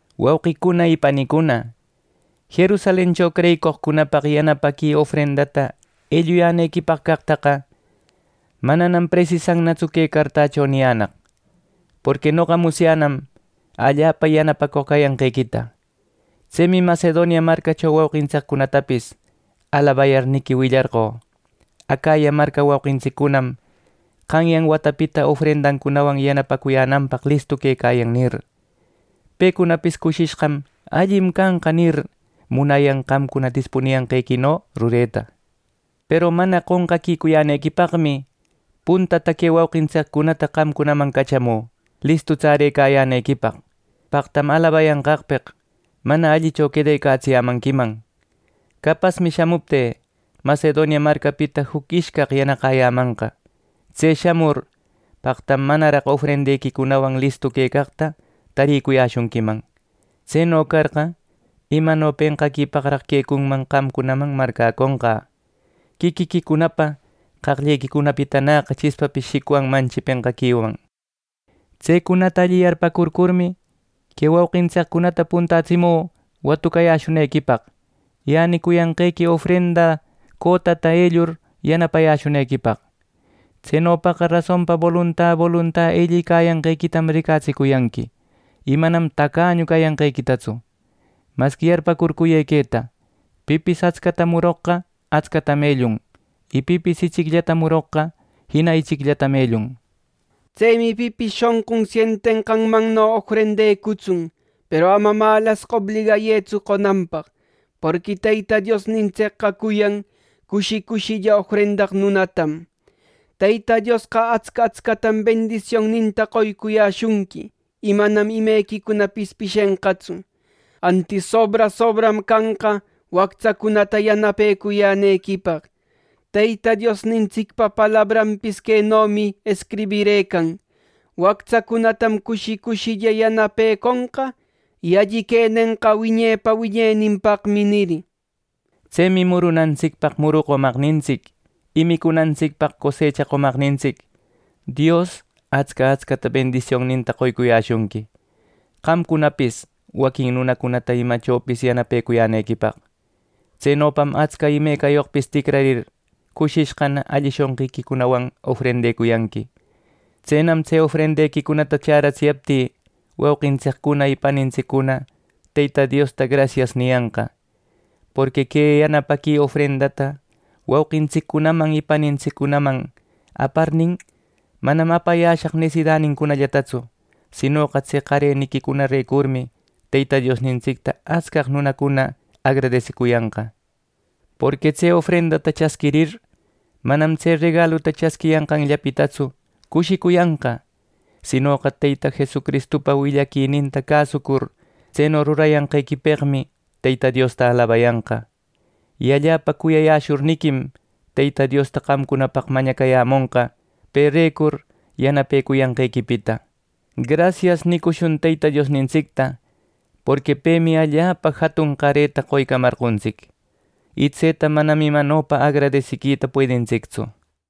Wauqicuna y panicuna, Jerusalencho creyicoqcunapaq yanapaqui ofrendata elluyänequipaq caqtaqa, manam presisannatsu que cartacho niyänaq. Porqui noqa musyänam allapa yanapacoq cayanqequita. Tsemi Macedonia marcacho wauqintsiccunatapis alabayarniqui willarqö: “Acaya marca wauqintsicunam qanyan watapitana ofrendawan yanapacuyänanpaq listu quecayan” nir, y pecunapis cushishqam “Allim canqa” nir, munayan qamcuna dispuniyanqequino rureta. Peru mana qonqaquicuyänequipaqmi puntata que wauqintsiccunata qamcunaman cachamü, listu tsarecayänequipaq, paqtam alabayanqaqpeq mana allicho quedecatsiyämanquiman. Capasmi shamuptï, Macedonia marcapita juc ishcaq yanaqäyämanqa. Tse shamur, paqtam manaraq ofrendequicunawan listu quecaqta tarïcuyäshunquiman. Tseno carqa, imano penqaquipaqraq quecunman qamcunaman marcäconqä. Quiquiquicunapa qaqllequicunapitanäqa chispapis shicwanmanchi penqaquiwan. Tsecunata alli yarpäcurcurmi, que wauqintsiccunata puntätsimü watucayäshunequipaq, y änicuyanqequi ofrenda cotata ellur yanapayäshunequipaq. Tsenopaqa rasonpa bolunta bolunta ellïcäyanqequitam ricatsicuyanqui, y manam tacañu cayanqequitatsu. Masqui yarpäcurcuyë queta: Pipis atscata muroqqa atscatam ellun; y pipis ichicllata muroqqa jina ichicllatam ellun. Tsemi pipis shonqun sientenqanmanno ofrendecutsun, peru ama malasqa obligayëtsu qonanpaq, porqui Teyta Diosnintsicqa cuyan cushi cushilla ofrendaq nunatam. Teyta Diosqa atsca atscatam bendisionninta qoycuyäshunqui, y manam imequicunapis pishenqatsu, antis sobra sobram canqa wactsacunata yanapecuyänequipaq. Teyta Diosnintsicpa palabranpis quenomi escribirëcan: “Wactsacunatam cushi cushilla yanapeconqa, y alli quenenqa wiñepa wiñeninpaqmi” nir. Tsemi murunantsicpaq muru qomaqnintsic, y micunantsicpaq cosecha qomaqnintsic Dios atsca atscata bendisionninta qoycuyäshunqui, qamcunapis waquin nunacunata imachopis yanapecuyänequipaq. Tsenopam atsca imecayoqpis ticrarir, cushishqana alli shonqiquicunawan ofrendecuyanqui. Tsenam tse ofrendequicunata chäratsiyaptï, wauqintsiccuna y panintsiccuna Teyta Diosta “Grasias” niyanqa. Porqui que yanapaqui ofrendata wauqintsiccunaman y panintsiccunaman aparnin, manam apayäshaq nesidanincunallatatsu, sinoqa tse qareniquicunarecurmi Teyta Diosnintsicta atscaq nunacuna agradesiquicuyanqa. Porqui tse ofrendata chasquirir, manam tse regaluta chasquiyanqanllapitatsu cushicuyanqa; sinoqa Teyta Jesucristupa willaquininta cäsucur tseno rurayanqequipeqmi Teyta Diosta alabayanqa. Y allapa cuyayäshurniquim Teyta Diosta qamcunapaq mañacayämonqa perecur yanapecuyanqequipita. “Grasias” nicushun Teyta Diosnintsicta, porqui pemi allapa jatun qareta qoycamarqontsic; y tseta manam imanopa agradesiquita puedintsictsu.